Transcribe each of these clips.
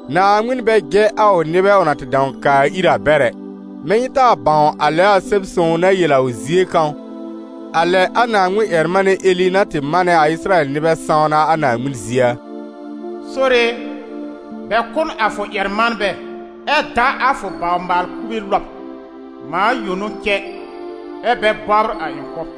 Naaŋmɩn bɛ jɛ a ʋ nɩbɛ ʋ na tɩ dãw kaa ir a bɛr ɛ. Mɛ̃ nyɩ taa bãw a lɛ a Sɛb-sõw na yel a ʋ zie kãw, a lɛ a Naaŋmɩn-ƴɛr-manɛ Eli na tɩ manɛ a Ɩsɩrayɛl nɩbɛ sãwna a Naaŋmɩn zie a? «Sore e, bɛ kʋ́ n a fʋ ƴɛr-manbɛ, ɛ da a fʋ baw-maal-kube lɔb: mãa yõ n'ʋ cɛ, ɛ́ bɛ bɔbr a ɩ̃ kʋ́b.»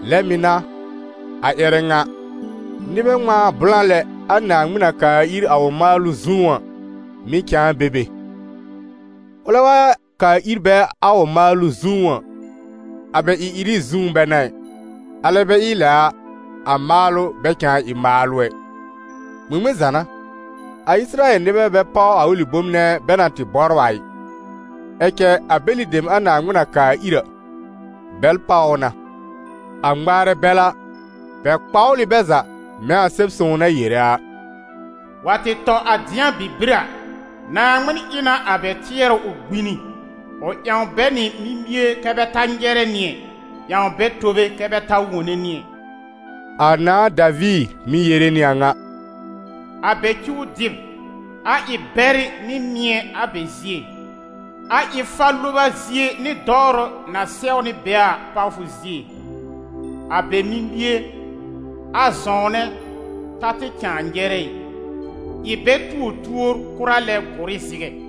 Lɛ mɩ̀ n'a, a ƴɛrɛ ŋa, nɩbɛ ŋmãa blã lɛ, a Naaŋmɩn na kaa ir a ʋ maalʋ zũú a, mɩ̀ cãa be be. Ʋlɛ wa kaa ir bɛ a ʋ maalʋ zũú a, a bɛ ɩ-ɩrɩ zũú bɛ n'a ɩ, alɛ bɛ ɩ lɛ a, a maalʋ bɛ cãa ɩ maalʋ ɛ. Ŋmɩŋmɩn za n'a? A Ɩsɩrayɛl nɩbɛ bɛ páw a ʋlɩ bom nɛ bɛ na tɩ bɔbr a ɩ; ɛ cɛ a bɛlɩ dem a Naaŋmɩn na kaa ir a, bɛl páw ʋ na; a ŋmaarɛ bɛl a, bɛ kpawl ɩ bɛ za, mɛ̃ a Sɛb-sõw na yere a: «Wa tɩ tɔ a dɩ̃a bibir a, Naaŋmɩn ɩ na a bɛ tɩɛrʋ ʋ gbini, ʋ ƴãw bɛ nɩ mimie kɛ́ bɛ ta nyɛrɛ nɩ ɛ, ƴãw bɛ tobe kɛ bɛ ta wone nɩ ɛ.» A nãà Daviir mɩ̀ yere nɩ a ŋa: «A bɛ cuw dɩb, a ɩ bɛrɩ nɩ mɩ̃ɛ a bɛ zie, a ɩ fa-loba zie nɩ dɔwrʋ na sɛwnɩ bɛ a pawfʋ zie. A bɛ mimie, a zɔ̃wnɛ ta tɩ cãa nyɛrɛ ɩ; ɩ bɛ tuo tuór kʋra lɛ gʋr ɩ zɩgɛ.»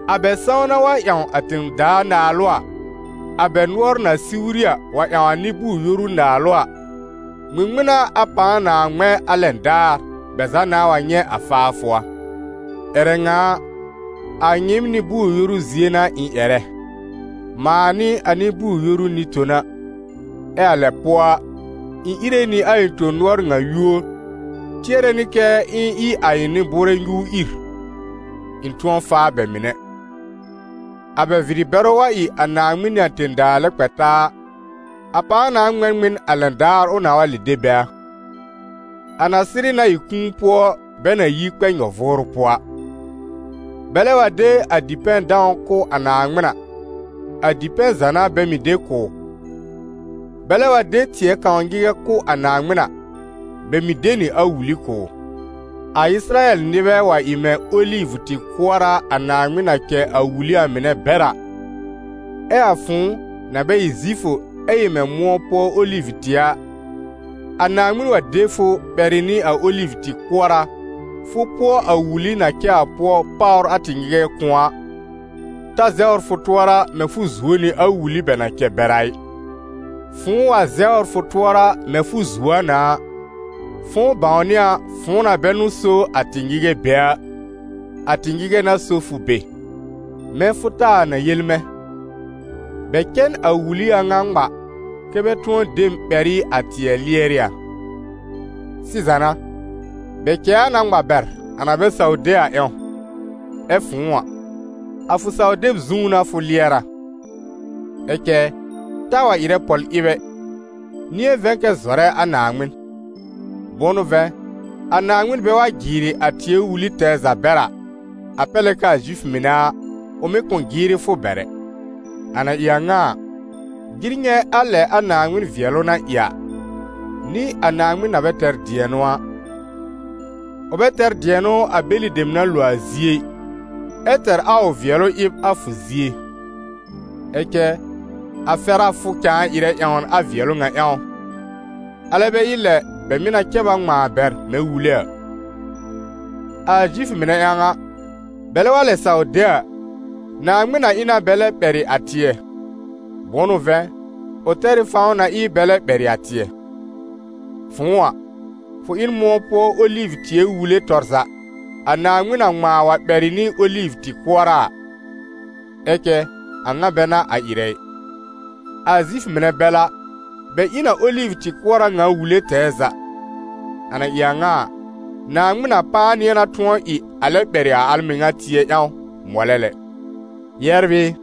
A bɛ sãwna wa ƴãw a tẽ-daa naalʋ a, a bɛ nʋɔr na siwri a wa ƴãw a nɩ-bʋʋr-yoru naalʋ a, ŋmɩŋmɩn n'a a pãa nãa ŋmɛ̃ a lɛn daar bɛ za nãa wa nyɛ̃ a faafʋ a! Ƴɛrɛ ŋa a, a nyɩɩm nɩ-bʋʋr-yoru zie n'a ɩ̃ ƴɛrɛ: mãa n'ɩ a nɩ-bʋʋr-yoru nɩ-tona, ɛ a lɛ pʋɔ a, ɩ̃ íre nɩ a ɩ̃ tõ-nʋɔr ŋa yúor, tɩɛrɛ nɩ k'ɩ̃ɩ ɩ a ɩ̃ bʋʋrɛ nyuur ìr, ɩ̃ tʋ̃ɔ faa bɛ mɩnɛ. A bɛ vɩrɩ-bɛrʋ wa ɩ a Naaŋmɩn nɩ a tẽ-daa lɛ kpɛ taa a, a pãa na ŋmɛ̃ n ŋmɩn a lɛn daar ʋ nãa wa lɛb de bɛ a? A na sɩrɩ na ɩ kũu pʋɔ bɛ na yi kpɛ nyɔ-vʋʋrʋ pʋɔ a! Bɛlɛ wa de a dipɛ̃-dãw kʋ̀ a Naaŋmɩn a, a dipɛ̃ za n'a bɛ mɩ̀ de kʋ̀ ʋ. Bɛlɛ wa de tɩɛ kãw nyɩgɛ kʋ̀ a Naaŋmɩn a, bɛ mɩ̀ de nɩ a wuli kʋ̀ ʋ. A Ɩsɩrayɛl nɩbɛ wa ɩ mɛ̃ olivʋ-tɩ-kʋɔra a Naaŋmɩn na cɛ a wuli a mɩnɛ bɛr a, ɛ a fʋ̃ʋ, na bɛ ɩ Zifʋ ɛ ɩ mɛ̃ mʋ̃ɔ pʋɔ olivʋ-tɩɛ a, a Naaŋmɩn wa de fʋ ɓɛrɩ nɩ a olivʋ-tɩ-kʋɔra, fʋ pʋɔ a ʋ wuli na cɛ a pʋɔ páwr a tɩ-nyɩgɛ kʋ̃ɔ a, ta zɛwr fʋ tʋɔra mɛ̃ fʋ zuo nɩ a wuli bɛ na cɛ bɛr a ɩ; fʋ̃ʋ wa zɛwr fʋ tʋɔra mɛ̃ fʋ zuo a na a, fʋ̃ʋ bãwnɩ a fʋ̃ʋ na bɛ n'ʋ so a tɩ-nyɩgɛ be a, a tɩ-nyɩgɛ n'a so fʋ be. Mɛ̃ fʋ taa na yel mɛ̃: «Bɛ cɛ n a wuli a ŋa ŋma, kɛ́ bɛ tʋ̃ɔ de mɛ̃ ɓɛr ɩ a tɩɛ lɩɛr ɩ a.» Sɩza n'a, bɛ cɛ a na ŋma bɛr, a na bɛ saw de a ƴãw, ɛ fʋ̃ʋ a, a fʋ saw-deb zũú n'a fʋ lɩɛr a. Ɛ cɛ taa wa ɩrɛ pɔl-ɩb ɛ, nɩ̃ɛ vɛ̃ kɛ zɔrɛ a Naaŋmɩn. Bʋ̃ʋ n'ʋ vɛ̃, a Naaŋmɩn bɛ wa jɩɩrɩ a tɩɛ wuli tɛɛ za bɛr a, a pɛr lɛ k'aa Zifʋ mɩnɛ a, ʋ mɩ̀ kʋ̃ jɩɩrɩ fʋ bɛr ɛ. A na ɩ a ŋa a, jɩr nyɛ̃ a lɛ a Naaŋmɩn vɩɛlʋ na ɩ a, nɩ a Naaŋmɩn na bɛ tɛr dɩ̃ɛnʋ a: ʋ bɛ tɛr dɩ̃ɛnʋ a bɛlɩ dem na lo a zie ɩ, ɛ́ tɛr a ʋ vɩɛlʋ ɩb a fʋ zie. Ɛ cɛ a fɛr a fʋ cãa ɩrɛ ƴãwn a vɩɛlʋ ŋa ƴãw, alɛ bɛ ɩ lɛ bɛ mɩ́ na cɛ b a ŋmãa bɛr mɛ̃ wule a. A Zifʋ mɩnɛ ƴãw a, bɛlɛ wa lɛ saw de a, Naaŋmɩn na ɩ na bɛ lɛ ɓɛrɩ a tɩɛ, bʋ̃ʋ n'ʋ vɛ̃, ʋ tɛr ɩ fãw na ɩ bɛ lɛ ɓɛrɩ a tɩɛ. Fʋ̃ʋ a, fʋ ɩ n mʋ̃ɔ pʋɔ olivʋ-tɩɛ wule tɔr za, a Naaŋmɩn na ŋmãa wa ɓɛrɩ nɩ olivʋ-tɩ-kʋɔra a, ɛ cɛ a ŋa bɛ n'a a ɩrɛ ɩ. A Zifʋ mɩnɛ bɛl a, bɛ ɩ n a olivʋ-tɩ-kʋɔra ŋa wuli tɛɛ za: a na ɩ a ŋa a, Naaŋmɩn na pãa nɩ̃ɛ na tʋ̃ɔ ɩ a lɛ ɓɛrɩ a al mɩŋa tɩɛ ƴãw mɔlɛ lɛ. Yɛbr ɩ,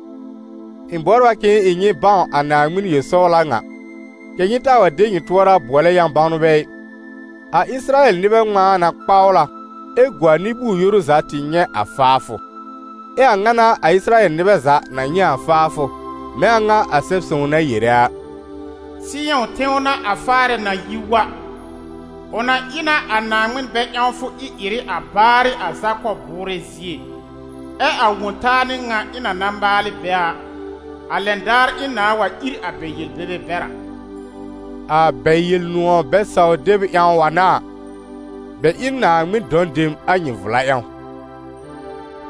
ɩ̃ bɔbr a k'ɩ̃ɩ ɩ nyɩ bãw a Naaŋmɩn yel-sɔwla ŋa, kɛ̀ nyɩ taa wa de nyɩ tʋɔra bʋɔlɛ yã-bãwnbɛ ɩ: a Ɩsɩrayɛl nɩbɛ ŋmãa na kpawl a, ɛ gu a nɩ-bʋʋr-yoru za tɩ nyɛ̃ a faafʋ. Ɛ a a ŋa n'a a Ɩsɩrayɛl nɩbɛ za na nyɛ̃ a faafʋ, mɛ̃ a ŋa a Sɛb-sõw na yere a: «Sɩyɔ̃ tẽw n'a a Faarɛ na yi wa, ʋ na ɩ na a Naaŋmɩn bɛ-ƴãwfʋ ɩ-ɩrɩ a baarɩ a Zakɔb bʋʋrɛ zie. Ɛ a Wõ-taa n'ɩ ŋa ɩ̃ na na maal ɩ bɛ a, a lɛn daar ɩ̃ nãá wa ìr a bɛ yel-bebe bɛr a.» A bɛ Yel-nʋ̃ɔ̀ bɛ-saw-deb ƴãw wa n'a a, bɛ ɩ n Naaŋmɩn dɔ̃ dem a nyɩɩm vla ƴãw;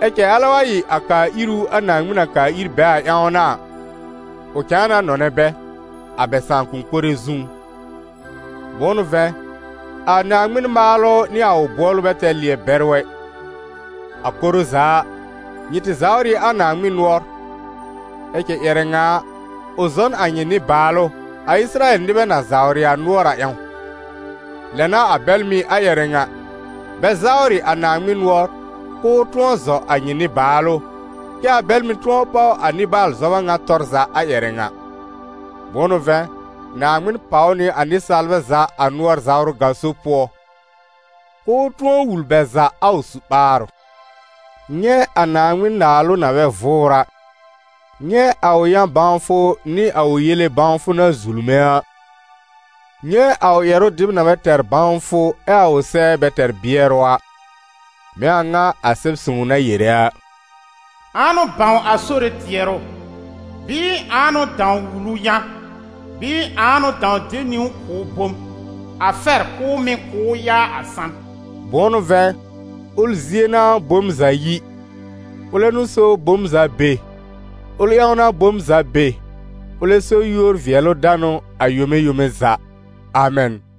ɛ cɛ alɛ wa ɩ a kaa-ìru a Naaŋmɩn na kaa ìr bɛ a ƴãw n'a a, ʋ cãa na nɔnɛ bɛ, a bɛ sãakʋm mɩnɛ zũú. Bʋ̃ʋ n'ʋ vɛ̃, a Naaŋmɩn maalʋ nɩ a ʋ bʋɔlʋ bɛ tɛr lɩɛ-bɛrʋ ɛ. A koro za a, nyɩ tɩ zawr ɩ a Naaŋmɩn nʋɔr, ɛ cɛ ƴɛrɛ ŋa a, ʋ zɔ n a nyɩ nɩ-baalʋ, a Ɩsɩrayɛl nɩbɛ na zawr a nʋɔr a ƴãw; lɛ n'a a bɛl mɩ̀ a ƴɛrɛ ŋa, bɛ zawrɩ a Naaŋmɩn nʋɔr, k'ʋʋ tʋ̃ɔ zɔ a nyɩ nɩ-baalʋ, kɛ́ a bɛl mɩ̀ tʋ̃ɔ páw a nɩ-baalʋ zɔba ŋa tɔr za a ƴɛrɛ ŋa. Bʋ̃ʋ n'ʋ vɛ̃, Naaŋmɩn pàw nɩ a nɩsaalbɛ za a nʋɔr-zawrʋ gaso pʋɔ, k'ʋʋ tʋ̃ɔ wul bɛ za a ʋ su-ɓaarʋ. Nyɛ̃ a Naaŋmɩn naalʋ na bɛ vʋʋr a! Nyɛ̃ a ʋ yã-bãwfʋ nɩ a ʋ yele bãwfʋ na zulme a! Nyɛ̃ a ʋ ƴɛrʋ dɩb na bɛ tɛr bãwfʋ, ɛ a ʋ sɛɛ bɛ tɛr bɩɛrʋ a! Mɛ̃ a ŋa a Sɛb-sõw na yere a: «Ãa n'ʋ bãw a Sore tɩɛrʋ? Bɩɩ ãa n'ʋ dãw wul ʋ yã? Bɩɩ ãa n'ʋ dãw de niwn kʋ̀ ʋ bom, a fɛr k'ʋʋ mɩ̀ kʋ̀ ʋ yaa a san?» Bʋ̃ʋ n'ʋ vɛ̃, ʋl zie n'a bom za yi, ʋlɛ n'ʋ so bom za be, ʋl ƴãw n'a bom za be; ʋlɛ so yúor-vɩɛlʋ-danʋ a yome yome za! Amɛn.